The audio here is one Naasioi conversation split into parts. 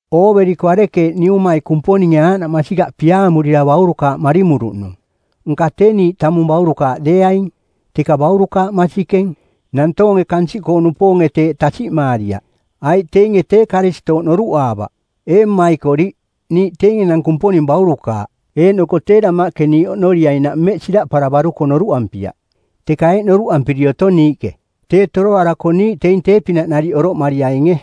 Ooveriko arekeeꞌ Niumai Kumponinge aaꞌnaꞌ masikaꞌ piaamurira baurukaaꞌ marimuruꞌnung. Nka tee niiꞌ tamung baurukaaꞌ deeaing, teka baurukaaꞌ masikeng. Nantoonge kansiꞌkoo-nupoonge teeꞌ tasiꞌmaariaꞌ, aiꞌ teinge tee Karistooꞌ noruꞌaavaꞌ. Ee mmaikoriꞌ, niiꞌ teing enang Kumponing baurukaaꞌ, eeꞌnoko tee damaꞌke niiꞌ oꞌnoriainaꞌ mmeꞌ siraꞌparavaruko noruꞌampiaꞌ. Teka eeꞌ noruꞌampiri otong niiꞌke: Tee toroarako niiꞌ teing tee-pinaꞌ nariꞌ oroꞌmariainge,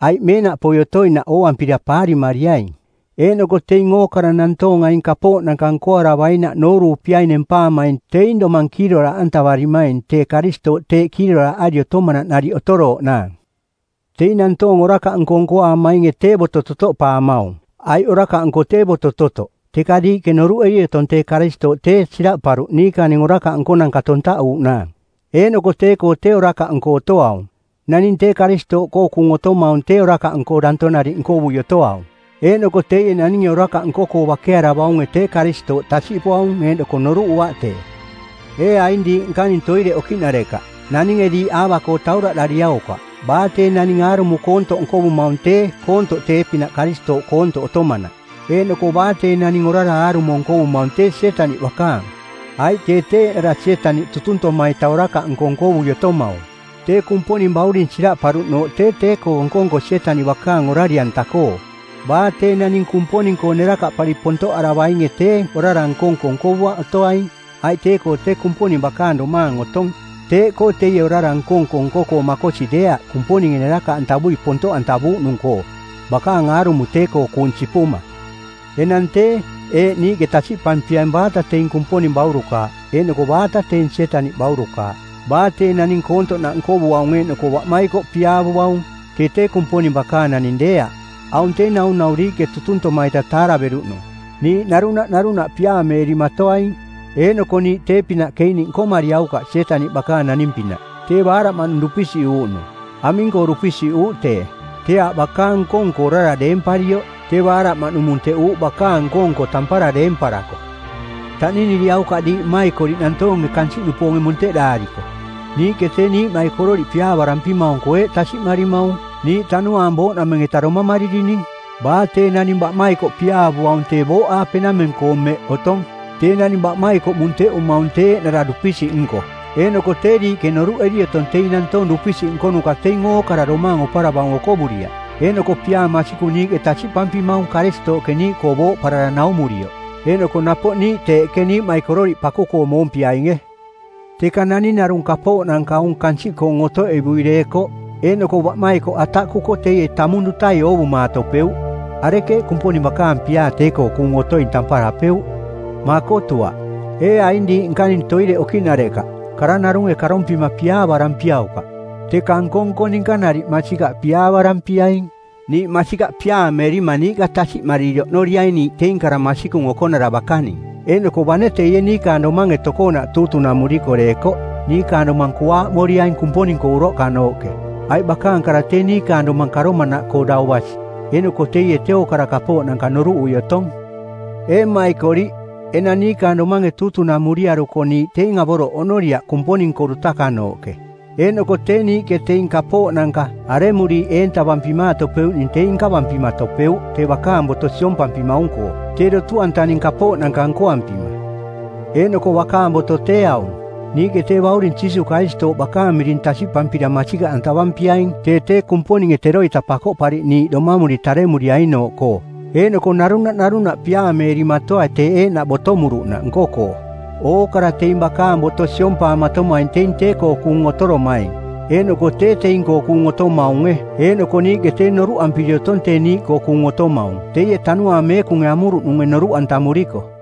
aiꞌ meenaꞌpoi otoinaꞌ ooampira paarimariaing. Eeꞌnoko teing ookara nantoong aing kapooꞌnanka nkoaravainaꞌ nooruupiai nempaamaing teing domang kiiroraaꞌantavarimaing tee Karistooꞌ teeꞌ kiiroraaꞌari otomanaꞌ nariꞌ otorooꞌnaang. Teing nantoong orakaꞌnko nkoaamainge tee boto totoꞌpaamaung, aiꞌ orakaꞌnko tee boto-totoꞌ. Teka diiꞌke noruꞌeri otong tee Karistooꞌ tee siraꞌparuꞌ niikaning orakaꞌ nkonanka tontaꞌuaꞌnaang, eeꞌnoko tee-koo tee orakaꞌnko otoaung. Naning tee Karistooꞌkoo kuung otomaung tee orakaꞌnko danto nariꞌ nkovui otoaung, eeꞌnoko teie naninge orakaꞌ nko-koo bakearavaunge tee Karistooꞌ tasiꞌpuaung eeꞌnoko noruꞌuaꞌ tee. Ee aing diiꞌ nkaning toireꞌ okiꞌnarekaꞌ, naninge diiꞌ aava-koo tauraꞌdariaukaꞌ. Baa tee naning aarumo koontoꞌ nkovumaung tee koontoꞌ tee-pinaꞌ Karistooꞌ koontoꞌ otomanaꞌ. Eeꞌnoko baa tee naning orara aarumo nkovumaung tee Sietaniꞌ bakaang, aiꞌ tee tee eeꞌnara Sietaniꞌ tutuntoma-ita orakaꞌnko nkovui otomaung. Tee Kumponing Bauring siraꞌparuꞌnooꞌ tee tee-koo nko-nko Sietaniꞌ bakaang orari-anta-koo. Baa tee naning Kumponing-koo nerakaꞌpari pontoꞌaravainge tee orara nko-nko nkovuaꞌ otoaing, aiꞌ tee-koo tee Kumponing bakaang domaang otong. Teeꞌkoo teie orara nko-nko nko-koo makosi deeaꞌ Kumponinge nerakaꞌantavui pontoꞌantavuuꞌnung-koo, bakaang aarumo tee-koo kuung sipuma. Enang tee, eeꞌ niiꞌke tasiꞌpampiaing baata teing Kumponing baurukaaꞌ eeꞌnoko baata teing Sietaniꞌ baurukaaꞌ: baa tee naning koontoꞌnaꞌ nkovuaung eeꞌnoko baꞌmaikoꞌ piaavuaung, tee tee Kumponing bakaang naning deeaꞌ. Aung tee naunau diiꞌke tutuntoma-ita taaraveruꞌnung, niiꞌ narunaꞌ narunaꞌ piaameerimatoaing. Eeꞌnoko niiꞌ tee-pinaꞌ Keiniꞌ nkomariaukaꞌ Sietaniꞌ bakaang naning-pinaꞌ, tee baaraꞌmaꞌnung dupisiꞌuuꞌnung. Aming-koo dupisiꞌuuꞌ tee? Tee aaꞌ bakaang nko-nko orara deemparioꞌ, tee baaraꞌmaꞌnung munteꞌuuꞌ bakaang nko-nko tampara deemparako. Taꞌniniriaukaꞌ diiꞌ mmaikoriꞌ nantoonge kansiꞌkoo-nupoonge munteꞌdaariko. Niiꞌke tee niiꞌmaikororiꞌ piaavarampimaung-koo eeꞌ tasiꞌmarimaung: niiꞌ tanuaang booꞌnameng-eta domamaririning. Baa tee naning baꞌmaikoꞌ piaavuaung tee booꞌaapenameng-koo mmeꞌ otong. Tee naning baꞌmaikoꞌ munteꞌumaung tee eeꞌnara dupisiꞌnko eeꞌnoko tee diiꞌke noruꞌeri otong teing nantoong dupisiꞌ nkonuka teing ookara domaang oparavaung okovuriaꞌ. Eeꞌnoko piaa masikung niiꞌke tasiꞌpampimaung Karistooꞌke niiꞌkoo booꞌparara naumurioꞌ, eeꞌnoko napoꞌ niiꞌ teeꞌke niiꞌmaikororiꞌ paku-koo moompiainge. Teka naning narung kapooꞌnanka aung kansiꞌkoong otoꞌevui deekoꞌ, eeꞌnoko baꞌmaikoꞌ ataꞌkuko teie tamung dutai oovumatopeuꞌ, arekeeꞌ Kumponing bakaang piaa tee-koo kuung otoing tamparapeuꞌ? Makotuaꞌ. Ee aing diiꞌ nkaning toireꞌ okiꞌnarekaꞌ, kara narunge karompima piaavarampiaukaꞌ, teka nko-nko ninka nariꞌ masikaꞌ piaavarampiaing. Niiꞌ masikaꞌ piaameerima niiꞌka tasiꞌmariri oꞌnoriaing niiꞌ teing kara masikung okonara bakaning, eeꞌnoko bane teie niikaang domange tokoonaꞌ tuutunamuriko deekoꞌ, niikaang domang kuaaꞌmoriaing Kumponing-koo uroꞌkanooꞌke. Aiꞌ bakaang kara tee niikaang domang karomanaꞌkoo dau basi, eeꞌnoko teie tee ookara kapooꞌnanka noruꞌui otong. Ee mmaikoriꞌ, enang niikaang domange tuutunamuriaruko niiꞌ teing avoroꞌ oꞌnoriaꞌ Kumponing-koo dutakanooꞌke. Eeꞌnoko tee niiꞌke teing kapooꞌnanka, aremuriiꞌ eentavampimaatopeuꞌning teing nkavampimatopeuꞌ tee bakaang boto siompampimaung-koo, tee dotu-antaning kapooꞌnanka nkoampima. Eeꞌnoko bakaang boto tee aung: Niiꞌke tee Bauring Jiisuuꞌ Karistooꞌ bakaang miring tasiꞌpampira masikaꞌantavampiaing tee tee Kumponinge teroita Pakoꞌpariꞌniiꞌ domamuri taremuriainooꞌkoo, eeꞌnoko narunaꞌ narunaꞌ piaameerimatoai teeꞌ eeꞌnaꞌ botomuruꞌnaꞌ nko-koo. Ookara teing bakaang boto siompaamatomaing teing tee-koo kuung otoromaing eeꞌnoko tee teing-koo kuung otomaunge. Eeꞌnoko niiꞌke tee noruꞌampiri otong tee niiꞌkoo kuung otomaung teie Tanuaang Meekunge amuruꞌnunge noruꞌantamuriko.